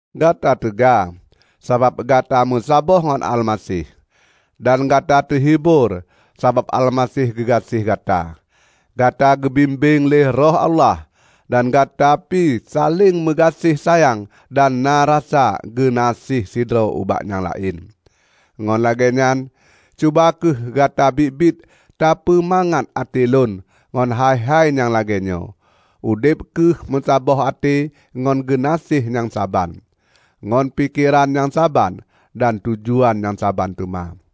Gata teuga, sabab gata meusaboh ngon Almaseh. Dan gata teuhibor sabab Almaseh geugaséh gata! Gata geubimbéng lé Roh Allah, dan gata pi saléng meugaséh sayang dan na rasa geunaséh sidroe ubak nyang laén. Ngon lagée nyan, cuba kheueh gata biet-biet tapeumangat até lôn ngon hai-hai nyang lagée nyoe: Udeb kheueh beusaboh até ngon geunaséh nyang saban, ngon pikeran nyang saban dan tujuan nyang saban teuma.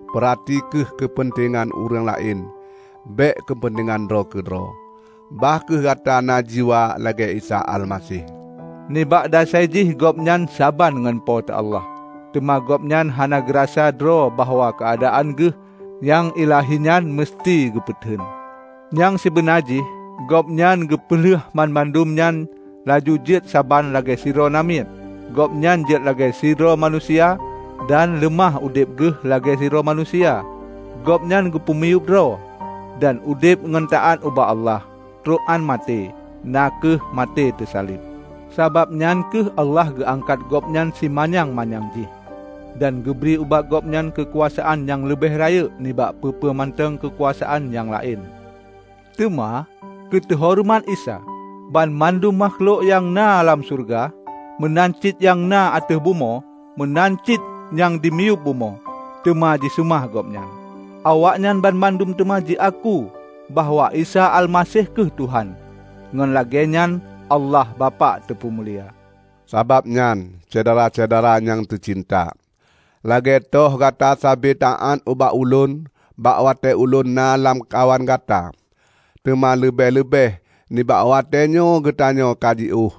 Peurati kheueh keupeuntengan ureuëng laén; bék keupeuntengan droe keudroe. Bah kheueh gata na jiwa lagée Isa Almaseh: Nibak dasai jih Gobnyan saban ngon Po teu Allah, teuma Gobnyan hana geurasa droe bahwa keuadaan geuh nyang ilahi nyan meuseuti geupeuteun. Nyang sibeuna jih, Gobnyan geupeulheuh banmandum nyan laju jeuet keusaban lagée sidroe namiet. Gobnyan jeuet lagée sidroe manusia, dan leumah udeb geuh lagée sidroe manusia. Gobnyan geupeumiyueb droe, dan udeb ngon taát ubak Allah trok án maté -- na kheueh maté teusaleb. Sabab nyan kheueh Allah geuangkat Gobnyan simanyang-manyang jih, dan geubri ubak Gobnyan keukuasaan nyang leubeh rayeuk nibak peue-peue mantong keukuasaan nyang laén. Teuma keuteuhoreumat Isa, banmandum makhlok nyang na lam syeuruga, meunan cit nyang na ateueh bumoe, meunan cit nyang di miyueb bumoe, teuma jiseumah Gobnyan. Awaknyan banmandum teuma jiaku bahwa Isa Almaseh kheueh Tuhan; ngon lagée nyan Allah Bapak teupeumulia. Sabab nyan, Syedara-syedara nyang teucinta, lagée toh gata sabe taát ubak ulôn bak watée ulôn na lamkawan gata, teuma leubeh-leubeh nibak watée nyoe geutanyoe ka jiôh,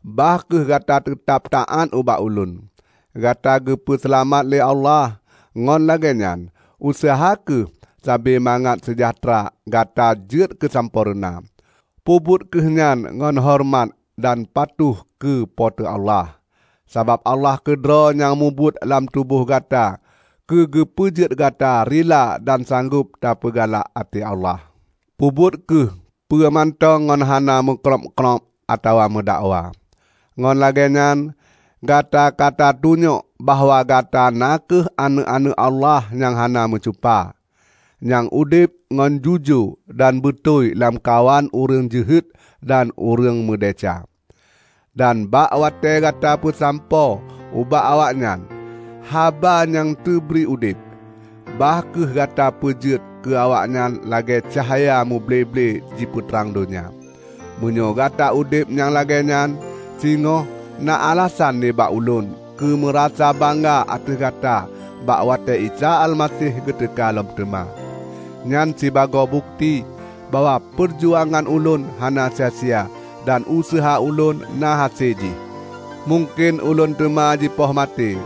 bah kheueh gata teutab taát ubak ulôn. Gata ka geupeu seulamat lé Allah, ngon lagée nyan useuha kheueh sabe mangat seujahteura gata jeuet keusampoereuna. Peubuet kheueh nyan ngon horeumat dan patuh keu Po teu Allah, sabab Allah keudroe nyang mubuet lam tuboh gata keugeupeujeuet gata rila dan sanggob tapeugalak até Allah. Peubuet kheueh peue mantong ngon hana meu krôb-krôb atawa meudakwa. Ngon lagée nyan gata katatunyok bahwa gata na kheueh aneuëk-aneuëk Allah nyang hana meucupa, nyang udeb ngon jujoe dan beutôi lamkawan ureuëng jeuhet dan ureuëng meudesya. Dan bak watée gata peusampoe ubak awaknyan haba nyang teubri udeb, bah kheueh gata peujeuet keu awaknyan lagée cahya muble-ble jipeutrang donya. Meunyoe gata udeb nyang lagée nyan, singoh na alasan nibak ulôn keu meurasa bangga ateueh gata bak watée Isa Almaseh geuteuka lom teuma. Nyan sibagoe bukeuti bahwa peujuangan ulôn hana sia-sia dan useuha ulôn na hase jih. Mungken ulôn teuma jipoh maté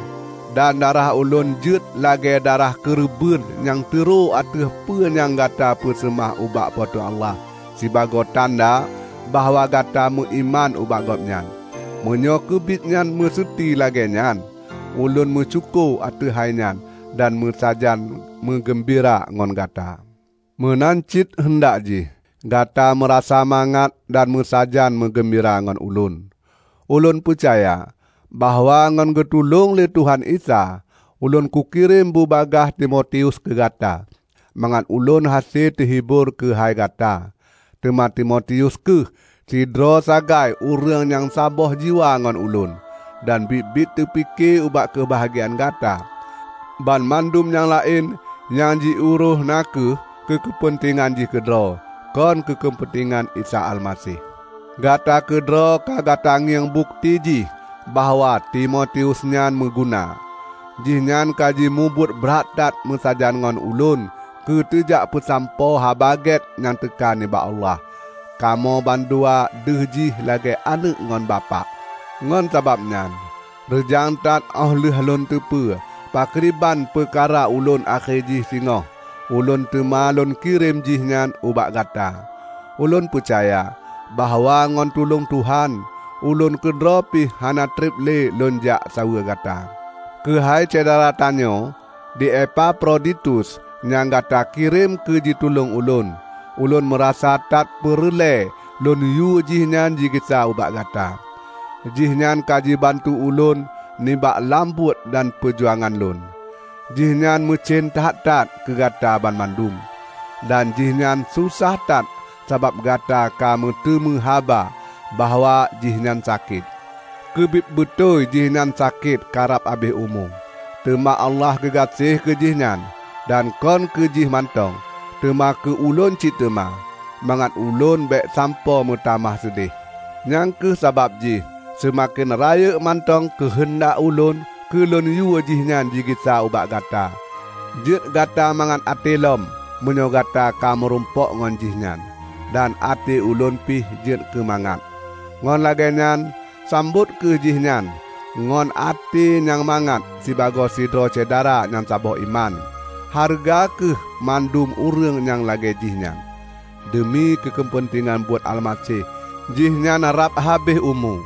dan darah ulôn jeuet lagée darah keureubeuen nyang teuroe ateueh peue nyang gata peuseumah ubak Po teu Allah sibagoe tanda bahwa gata meuiman ubak Gobnyan. Meunyoe keubit nyan meuseuti lagée nyan, ulôn meusyukoe ateueh hainyan dan meusajan meugeumbira ngon gata. Meunan cit heundak jih gata meurasa mangat dan meusajan meugeumbira ngon ulôn. Ulôn peucaya bahwa ngon geutulông lé Tuhan Isa, ulôn kukirém bubagaih Timotius keu gata, mangat ulôn hase teuhibor keuhai gata. Teuma Timotius kheueh sidroe sagai ureuëng nyang saboh jiwa ngon ulôn, dan biet-biet teupike ubak keubahgiaan gata. Banmandum nyang laén nyang jiurôih na kheueh keu keupeuntengan jih keudroe, kon keupeuntengan Isa Almaseh. Gata keudroe ka gata ngieng bukeuti jih bahwa Timotius nyan meuguna. Jihnyan ka jimubuet brat that meusajan ngon ulôn keuteujak peusampoe Haba Gét nyang teuka nibak Allah. Kamoe bandua deuh jih lagée aneuëk ngon bapak. Ngon sabab nyan, reujang that óh lheueh lôn teupeue pakriban peukara ulôn akhé jih singoh, ulôn teuma lôn kirém jih nyan ubak gata. Ulôn peucaya bahwa ngon tulông Tuhan, ulôn keudroe pih hana treb lé lôn jak saweue gata. Keuhai syedara tanyoe di Epafroditus nyang gata kirém keu jitulông ulôn, ulôn meurasa that peureulée lôn yue jihnyan jigisa ubak gata. Jihnyan ka jibantu ulôn nibak lam buet dan peujuangan lôn. Jihnyan meucen that-that keugata banmandum, dan jihnyan sosah that sabab gata ka meuteumé haba bahwa jihnyan sakét. Keubiet beutôi jihnyan sakét karab habéh umu. Teuma Allah geugaséh keu jih nyan; dan kon keu jih mantong, teuma keu ulôn cit teuma, mangat ulôn bék sampoe meutamah seudeh. Nyang kheueh sabab jih seumaken rayeuk mantong keuheundak ulôn keu lôn yue jihnyan jigisa ubak gata, jeuet gata mangat até lom meunyoe gata ka meurumpok ngon jih nyan, dan até ulôn pih jeuet keumangat. Ngon lagée nyan, sambot kheueh jihnyan ngon até nyang mangat sibagoe sidroe syedara nyang saboh iman. Hareuga kheueh mandum ureuëng nyang lagée jih nyan. Deumi keu keupeuntengan buet Almaseh, jihnyan rab habéh umu;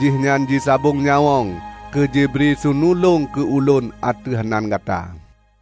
jihnyan jisabong nyawöng keujibri seunulông keu ulôn ateueh nan gata.